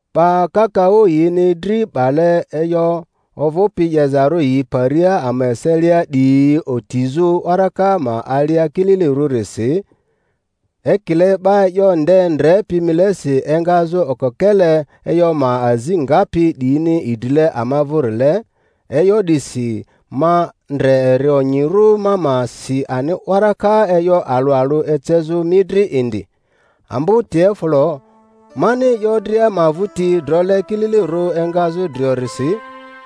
'Ba kakaᴜ yini dri 'bale e'yo ovᴜpi 'yezarᴜ yi paria ama eselia 'diyi otizᴜ waraka ma alia kililirᴜrisi, ekile 'ba e'yo nde ndrepi milesi engazᴜ okokele e'yo ma azi ngapi 'diyini idrile ama vᴜrile, e'yo 'disi ma ndre eri onyirᴜ ma ma si ani waraka e'yo alᴜ alᴜ ecezᴜ mi dri indi, ambo Teofilo, mani e'yo dria ma vᴜti drole kililirᴜ engazᴜ driorisi;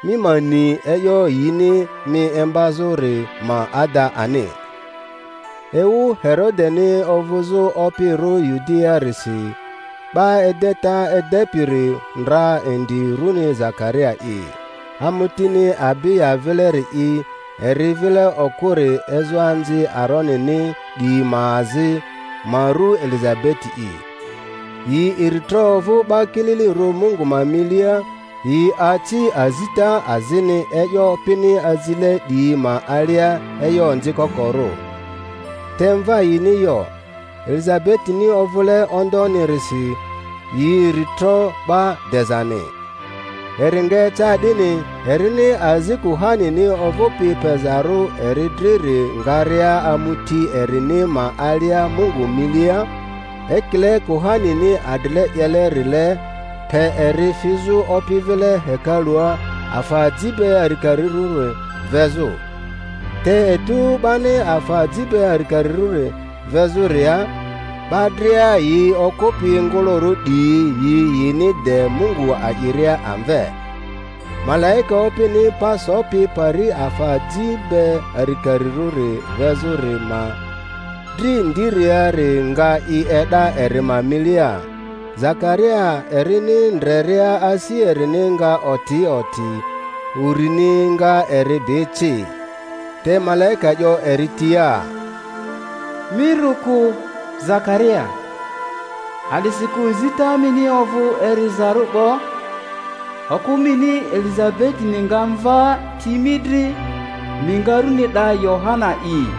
mi ma ni e'yo yini mi imbazᴜri ma ada ani. Ewu Herodeni ovᴜzᴜ opirᴜ Yudiaarisi, 'ba edeta edepiri ndra indi runi Zakaria'i, amutini Abiya vileri'i; eri vile okᴜri ezoanzi Aronini 'diyi ma azi, ma ru Elizabeti'i. Yi iritro ovᴜ 'ba kililirᴜ Mungu ma milia, yi aci azita azini e'yo Opini azile 'diyi ma alia e'yo onzi kokorᴜ. Te mva yini yo, Elizabetini ovᴜle ondonirisi, yi iri tro 'ba dezani. Eri nga eca 'dini, erini azi kuhanini ovᴜpi pezarᴜ eri driri ngaria amuti erini ma alia Mungu milia, ekile kuhanini adrile 'yelerile, pe eri fizᴜ Opi vile hekalᴜa afa aji be arikarirᴜri vezᴜ. Te etu 'bani afa aji be arikarirᴜri vezᴜria, 'ba dria yi okᴜpi ngᴜlᴜrᴜ 'diyi yi yini de Mungu a'iria amve. Malaika Opini pa sopi pari afa aji be arikarirᴜri vezᴜri ma dri ndiriari nga i e'da eri ma milia. Zakaria erini ndreria asi erini nga oti oti, urini nga eri bi ci. Te malaika 'yo eri tia, Mi rᴜ kᴜ, Zakaria, a'disikᴜ zita mini ovᴜ erizarᴜ 'bo, okᴜ mini Elizabetini nga mva ti mi dri, mi nga runi 'da Yohana'i.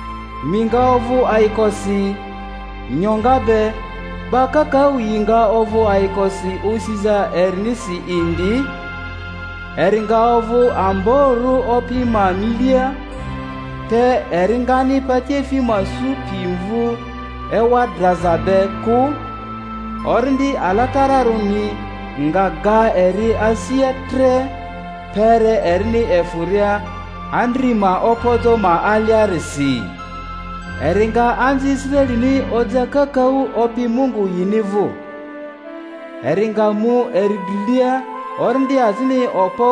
Mi nga ovᴜ ayikosi nyoŋa be, 'ba kakaᴜ yi nga ovᴜ ayikosi osiza erinisi indi; eri nga ovᴜ amborᴜ Opi ma milia, te eri ngani patiefi ma su pi mvu ewa draza be kᴜ; Orindi Alatararᴜni nga ga eri asia tre, kpere erini efᴜria andri ma opojo ma aliarisi. Eri nga anzi Israelini oja kakaᴜ Opi Mungu yini vᴜ. Eri nga mu eri drilia orindi azini okpo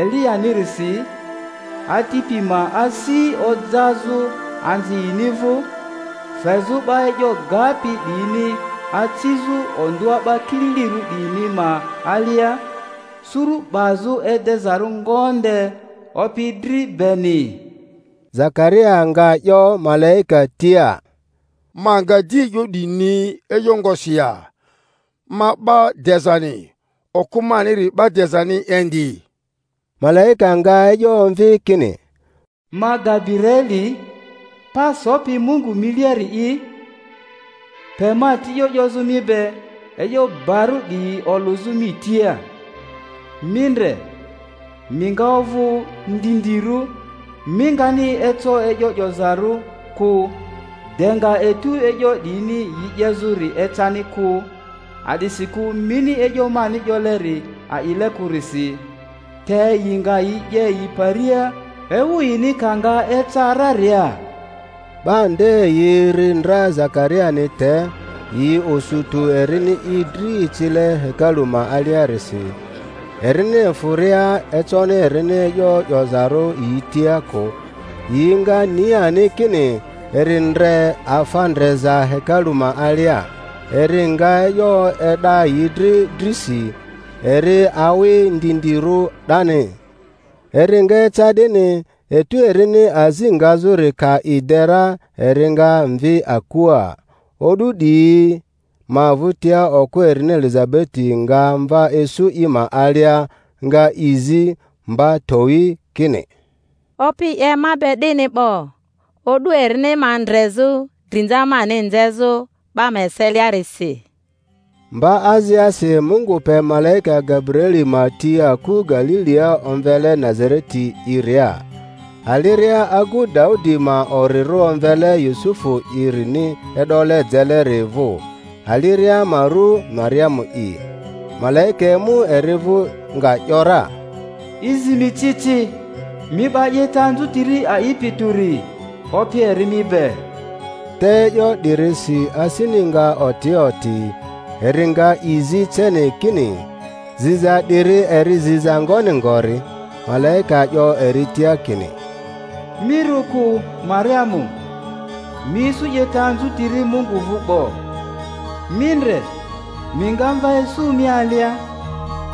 Eliyanirisi, atipi ma asi ojazᴜ anzi yini vᴜ, fezᴜ 'ba e'yo gapi 'diyini acizᴜ ondᴜa 'ba kililirᴜ 'diyini ma alia; suru 'bazᴜ edezarᴜ ngonde Opi dri beni. Zakaria.nga 'yo malaika tia, Ma nga di e'yo 'di ni e'yo ngosi ya? Ma 'ba dezani, okᴜ maniri 'ba dezani indi. Malaika nga e'yo omvi kini, Ma Gabiraeli, pa sopi Mungu miliari'i; pe ma ti e'yo 'yozᴜ mi be, e'yo barᴜ 'diyi olᴜzᴜ mi tia. Mi ndre, mi nga ovᴜ ndindirᴜ, mi ngani eco e'yo 'yozarᴜ kᴜ de nga etu e'yo 'diyini yi 'yezᴜri ecani kᴜ, a'disikᴜ mini e'yo mani 'yoleri a'ile kᴜrisi, te yi nga yi 'ye yi paria ewu yini ka nga eca raria. 'Ba nde yi ri ndra Zakariani te, yi osu tᴜ erini i dri icile hekalu ma aliarisi. Erini efᴜria econi erini e'yo 'yozarᴜ yi tia kᴜ, yi nga ni ani kini eri ndre afa ndreza hekalu ma alia; eri nga e'yo e'da yi dri drisi, eri awi ndindirᴜ 'dani. Eri nga eca 'dini, etu erini azi ngazᴜri ka i de ra, eri nga mvi akua. O'du 'diyi ma vᴜtia okᴜ erini Elizabeti nga mva isu i ma alia, nga i zi mba towi, kini, Opi 'ye ma be 'dini 'bo o'du erini ma ndrezᴜ, drinza mani nzezᴜ 'ba ma eseliarisi. Mba aziasi Mungu pe malaika Gabiraeli ma ti aku Galilia omvele Nazareti'iria, aliria agu Daudi ma orirᴜ omvele Yusufu'irini e'dole jeleri vᴜ; aliria ma ru Mariamu'i. Malaika emu eri vᴜ, nga ‘yora, I zi mi ci ci, mi 'ba 'yeta anzutiri a'ipi tᴜri, Opi eri mi be! Te e'yo 'dirisi asini nga oti oti, eri nga i zi ceni kini, ziza 'diri eri ziza ngoni ngori. Malaika 'yo eri tia kini, Mi rᴜ kᴜ, Mariamu, mi isu 'yeta anzutiri Mungu vᴜ 'bo. Mi ndre, mi nga mva isu mi alia,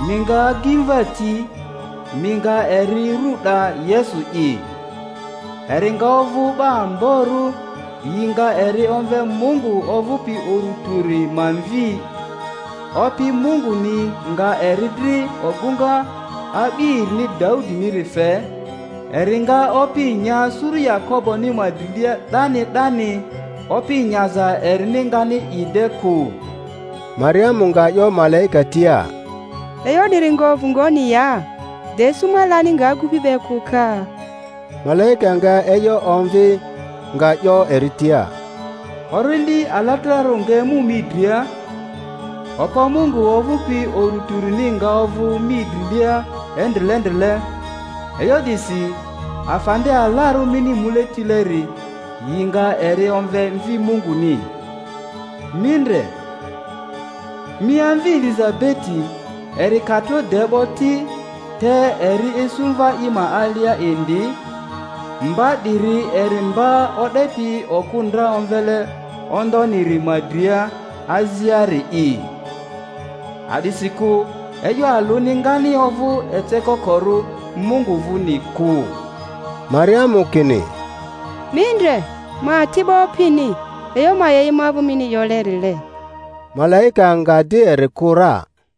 mi nga agimva ti, mi nga eri ru 'da Yesu'i. Eri nga ovᴜ 'ba amborᴜ, yi nga eri omve Mungu ovᴜpi Uru Tᴜri ma Mvi; Opi Munguni nga eri dri ogᴜŋa a'bi erini Daudiniri fe, eri nga opi nya suru Yakoboni ma drilia 'dani 'dani; opi nyaza erini ngani i de kᴜ. Mariamu nga 'yo malaika tia, E'yo 'diri nga ovᴜ ngoni ya, de isu ma lani nga agupi be kᴜ ka? Malaika nga e'yo omvi, nga 'yo eri tia, Orindi Alatararᴜ nga emu mi dria, okpo Mungu ovᴜpi Uru Tᴜrini nga ovᴜ mi drilia endrilendrile; e'yo 'disi afa nde alarᴜ mini mule tileri, yi nga eri omve Mvi Munguni. Mi ndre, mi amvi Elizabeti, eri ka tro de 'bo ti, te eri isu mva i ma alia indi; mba 'diri eri mba o'depi okᴜ ndra omvele ondoniri ma dria aziari'i. A'disikᴜ e'yo alᴜni ngani ovᴜ ecokokorᴜ Mungu vᴜni kᴜ. Mariamu kini, Mi ndre, ma ati'bo Opini; e'yo ma 'ye i ma vᴜ mini 'yolerile. Malaika nga di eri kᴜ ra.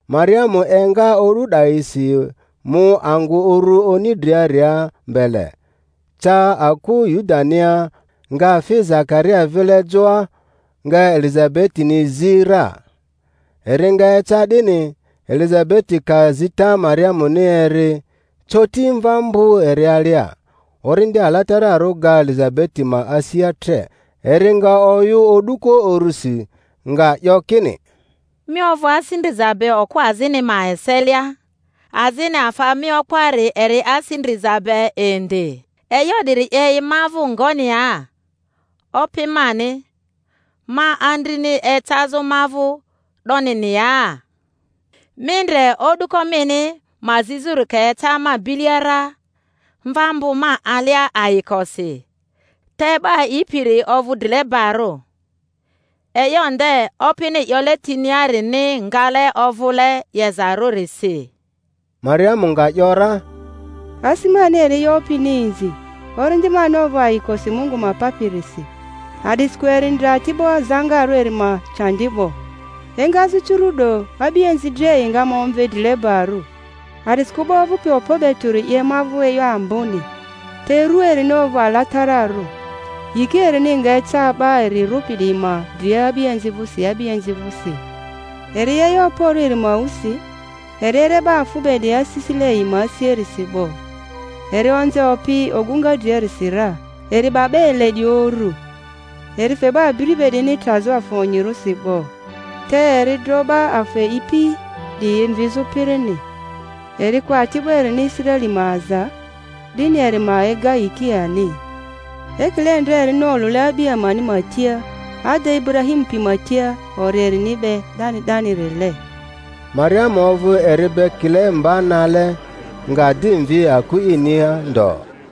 Mariamu enga o'du 'dayisi, mu angᴜ uru oni driaria mbele, ca aku Yudania, nga fi Zakaria vile joa, nga Elizabetini zi ra. Eri nga eca 'dini, Elizabeti ka zita Mariamuni eri, coti mva mbᴜ eri alia; Orindi Alatararᴜ ga Elizabeti ma asia tre, eri nga oyᴜ o'duko urusi, nga 'yo kini, Mi ovᴜ asi ndriza be okᴜ azini ma eselia, azini afa mi opoari eri asi ndriza be indi! E'yo 'diri 'ye i ma vᴜ ngoni ya, Opi mani ma andrini ecazᴜ ma vᴜ 'donini ya? Mi ndre, o'duko mini ma zizᴜri ka eca ma bilia ra, mva mbᴜ ma alia ayikosi. Te 'ba a'ipiri ovᴜ drilebarᴜ; e'yo nde Opini 'yole tiniarini ngale ovᴜle 'yezarᴜrisi. Mariamu nga 'yora, Asi mani eri e'yo Opini inzi, orindi mani ovᴜ ayikosi Mungu ma Papirisi, a'disikᴜ eri ndre ati'bo zaŋarᴜ erini ma candi 'bo. Te emi ndre, engazᴜ curu'do a'bianzi dria yi nga ma omve drilebarᴜ; a'disikᴜ 'ba ovᴜpi okpo be tᴜri 'ye ma vᴜ e'yo amboni, te ru erini ovᴜ alatararᴜ. Yiki erini nga eca 'ba eri rᴜpi 'diyi ma dria a'bianzi vᴜsi a'bianzi vᴜsi. Eri 'ye e'yo okporᴜ eri ma wusi, eri ere 'ba afᴜ be 'diyi asisile yi ma asiarisi 'bo, eri onze opi ogᴜŋa driarisi ra, eri 'ba 'ba ele 'diyi uru; eri fe 'ba abiri be 'diyini trazᴜ afa onyirᴜsi 'bo, te eri dro 'ba afa e'ipi 'diyi mvizᴜ pirini. Eri ko ati'bo erini Israeli ma aza, 'dini eri ma ega yiki ani, ekile ndra erini olᴜle a'bi amani ma tia, ada, Iburahimu pi ma tia ori erini be 'dani 'danirile. Mariamu ovᴜ eri be kile mba nale, nga di mvi aku inia ndo.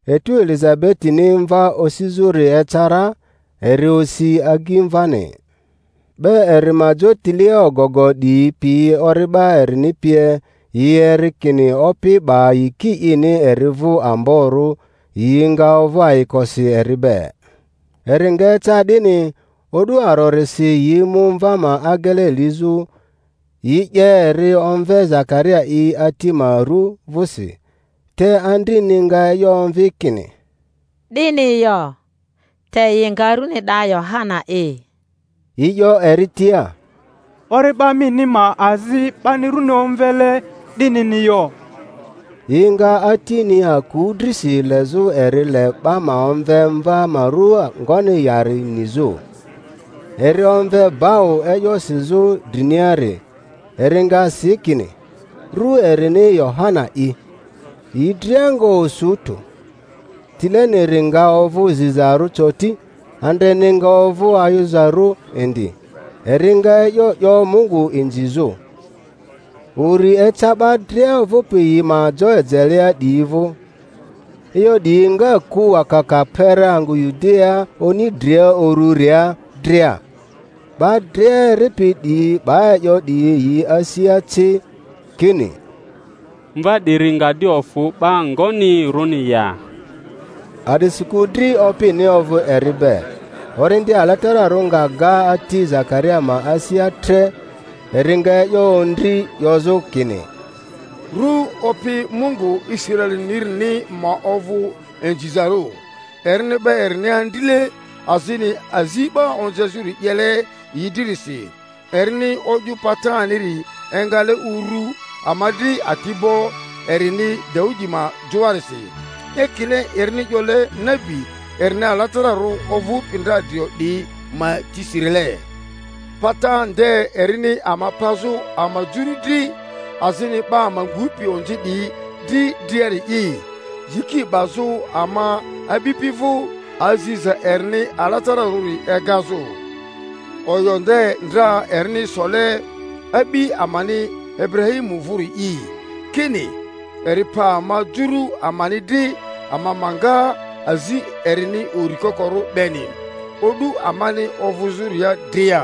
Etu Elizabetini mva osizᴜri eca ra, eri osi agimvani. 'Ba eri ma jotilea ogogo 'diyi pi ori'ba erini pie, yi eri kini Opi 'ba yiki ini eri vᴜ amborᴜ, yi nga ovᴜ ayikosi eri be. Eri nga eca 'dini, o'du arorisi yi mu mva ma agele lizᴜ; yi 'ye eri omve Zakaria i ati ma ru vᴜsi, te andrini nga e'yo omvi kini, 'Dini yo; te yi nga rᴜni 'da Yohana'i. Yi 'yo eri tia, Ori'ba mini ma azi 'bani runi omvele 'dinini yo. Yi nga atini aku drisi lezᴜ eri le 'ba ma omve mva ma ru ngoni yari nizᴜ. Eri omve bau e'yo sizᴜ driniari, eri nga si kini, Ru erini Yohana'i. Yi dria nga osu tᴜ. Tileniri nga ovᴜ zizarᴜ coti, andreni nga ovᴜ ayuzarᴜ indi, eri nga e'yo 'yo Mungu inzizᴜ. Uri eca 'ba dria ovᴜpi yi ma jo ejelea 'diyi vᴜ. E'yo 'diyi nga ku wakaka kpere angᴜ Yudiaa oni dria urᴜria dria; 'ba dria eripi 'diyi 'ba e'yo 'diyi yi asia ci, kini, Mva 'diri nga di ofᴜ 'ba ngonirᴜni ya? A'disikᴜ dri Opini ovᴜ eri be. Orindi Alatararᴜ nga ga ati Zakaria ma asia tre, eri nga e'yo ondri 'yozᴜ kini, Ru Opi Mungu Israelinirini ma ovᴜ inzizarᴜ, erini 'ba erini andrile azini azi 'ba onzezᴜri 'yele yi dririsi, erini o'yᴜ pataniri engale uru ama dri ati'bo erini Daudi ma joarisi, (ekile erini 'yole nabi erini alatararᴜ ovᴜpi ndra drio 'diyi ma tisirile) pata nde erini ama pazᴜ ama juru dri, azini 'ba ama ngupi onzi 'diyi dri driari'i; yiki 'bazᴜ ama a'bipi vᴜ, aziza erini alatararᴜri egazᴜ, oyo nde ndra erini sole a'bi amani Iburahimu vᴜri'i, kini eri pa ama juru amani dri ama ma nga azi erini uri kokorᴜ beni, o'du amani ovᴜzᴜria dria,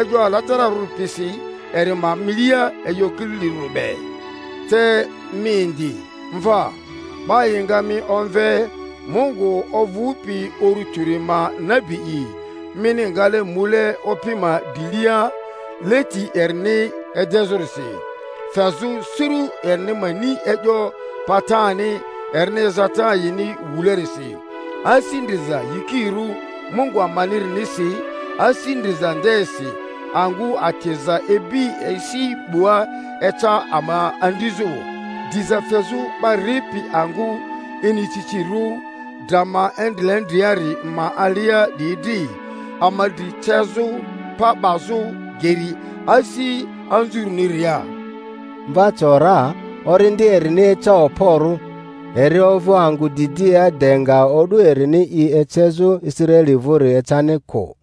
e'yo alatararᴜri pisi eri ma milia e'yo kililirᴜri be. Te mi indi, mvaa, 'ba yi nga mi omve Mungu ovᴜpi Uru Tᴜri ma nabi'i; mini ngale mule Opi ma drilia leti erini edezᴜrisi, fezᴜ suru erini ma ni e'yo patani erini ezata yini wulerisi, asi ndriza yikirᴜ Mungu amanirinisi, asi ndriza ndesi angᴜ atiza ibi esi 'bua eca ama andrizu diza fezᴜ 'ba ripi angᴜ inicicirᴜ dra ma endrilendriari ma alia 'diyi dri, ama dri cezᴜ pa 'bazᴜ geri asi anzurᴜniria. Mva co ra, orindi erini eca okporᴜ, eri ovᴜ angᴜ didia de nga o'du erini i ecezᴜ Israeli vᴜri ecani kᴜ.